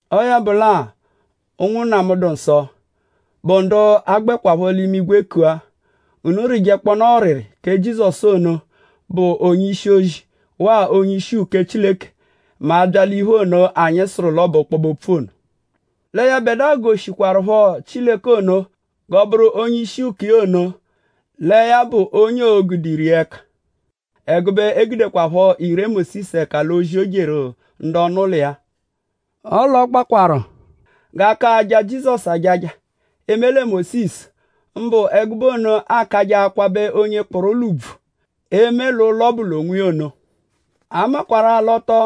Ọo ya bụ lẹ-a; ụnwunna mu, dụ nsọ, bụ ndu a gbẹkwapho l'imigwe kua; unu rịjekponaa ọriri kẹ Jizọsu ono, bụ onye-ishi-ozi; waa onye-ishi uke Chileke mẹ a -bya l'iphe ono, anyi sụru l'ọ bụ ọkpobe-opfu ono. Lẹ yẹbedua goshiẹkwarupho Chileke ono, họtaru iya g'ọ bụru onye-ishi uke iya ono lẹ ya bụ onye o gude ire iya ẹka; ẹgube e gudekwaphọ ire Mósisu ẹka l'ozi, o jeru ndu ọnu-ụlo iya. Ọle ọ gbakwarụ g'a ka aja Jizọsu ajaja eme lẹ Mósisu; mbụ ẹgube ono aakajẹ akwabẹ onye kpụru ụlo ùbvù; eme l'ụlo ọbu l'onwiya ono. A makwarụ-a l'ọ tọ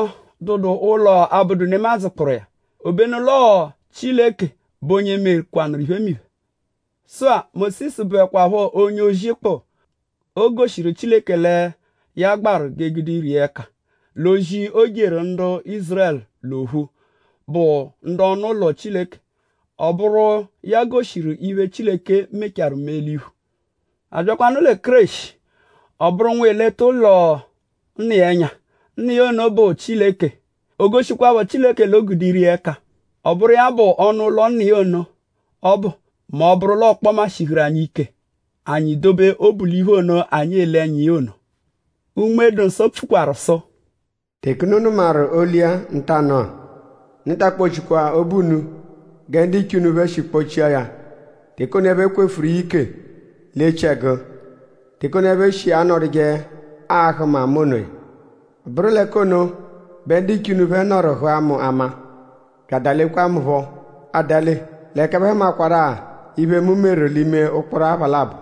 dụdu ụlo, abụdu nemadzụ kpụru iya; obenu l'ọo Chileke bụ onye mekwanụru iphemiphe. Sụ-a; Mósisu bụekwapho onye-ozi kpụ. O goshiru Chileke lẹ ya gbaru g'e gude ire iya ẹka l'ozi, o jeru ndu Ízurẹlu l'ophu, bụ ndu ọnu-ụlo Chileke. Ọ bụru iya goshiru iphe, Chileke mechaarụ mee l'iphu. A byakwanụ lẹ Kéreshi; ọ bụru Nwa, eleta ụlo Nna iya ẹnya. Nna iya ono bụ Chileke. O goshikwaphọ Chileke l'o gude ire iya ẹka. Ọ bụru anyi bụ ọnu-ụlo Nna iya ọbu mẹ ọ -bụru l'ọkpoma shihuru anyi ike; anyi dobe obu l'iphe ono, anyi ele ẹnya iya ono. Unme-dụ-Nsọ pfukwaru sụ: “Teke unu nụmaru olu iya ntanụ-a; unu ta akpọ-chikwa obu unu gẹ ndiche unu phẹ shi kpọ-chia ya teke ono ẹphe kwefuru iya ike l'echiẹgu; teke ono, ẹphe shi anọduje ahụ mu ama onoya. Ọ bụru l'ẹka ono bẹ ndiche unu phẹ nọru hụa mu ama; bya adalekwaa mu phọ adale; l'ẹka ẹphe hụmakwaru-a iphe, mu meru l'ime ụkporo apha labọ.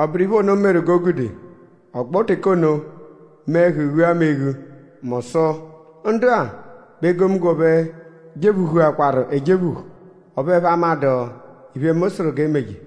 Ọ bụru iphe ono meru g'o gude ọgbo teke ono mee ẹhu ghua mu eghu mu sụ: ‘Ndu-a bẹ egomunggo phẹ jephuhuakwaru ejephuhu; ọphu ẹphe amadụ iphe, mu sụru g'e meje.’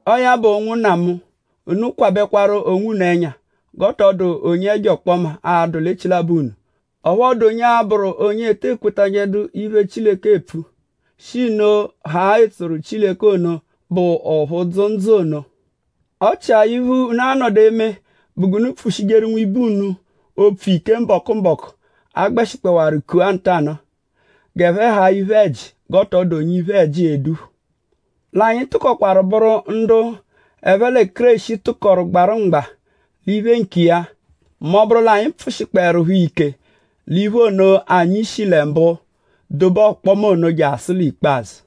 Ọo ya bụ; ụnwunna mu; unu kwabẹkwaru onwunu ẹnya g'ọ tọ dụ onye ẹjo ọkpoma a-dụ l'echilabọ unu; ọphu ọ dụ onye a-bụru onye te ekwetajẹdu iphe, Chileke epfu; shi nno haa etsoru Chileke ono, bụ ọphu dzụ ndzụ ono. Ọ chia iphe, unu a-nọdu eme bụ g'unu pfushijeru nwibe unu opfu ike mbọku-mbọku, a gbẹshikpowaru kua “Ntanụa” g'ẹphe haa iphe-ẹji g'ọ tọ dụ onye iphe-ẹji e-dephu. L'anyi tụkokwaru bụru ndu ẹphe lẹ Kéreshi tụkoru gbarụ mgba l'iphe nkiya mẹ ọ -bụru l'anyi pfụ-shikpọerupho ike l'iphe ono, anyi shi lẹ mbụ dobe ọkpoma ono jasụ l'ikpazụ.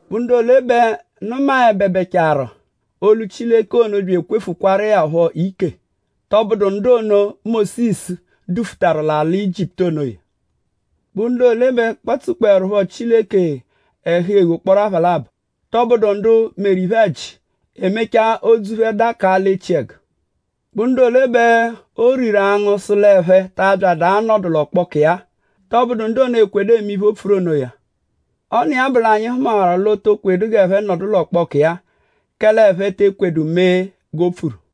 ?Bụ ndu ole bẹ nụmabebecharu olu Chileke ono bya ekwefukwaru iya phọ ike??Tọ bụedu ndu ono, Mósisu dufutaru l'alị Ijiputu onoya? ?Bụ ndu ole bẹ kpatsukpọerupho Chileke ẹhu eghu ụkporo apha labọ??Tọbudu ndu meru iphe-ẹji; e mechaa odzu phẹ dakaa l'echiẹgu? ?Bụ ndu ole bẹ o riru angụ sụ l'ẹphe ta abyadụ anọdu l'ọkpoku iya-a? Tọbudu ndu ono, ekwedu eme iphe, o pfuru onoya. Ọ n'iya bụ l'anyi hụmawaru l'o to kwedu g'ẹphe nọdu l'ọkpoku iya kẹle ẹphe te ekwedu mee g'o pfuru.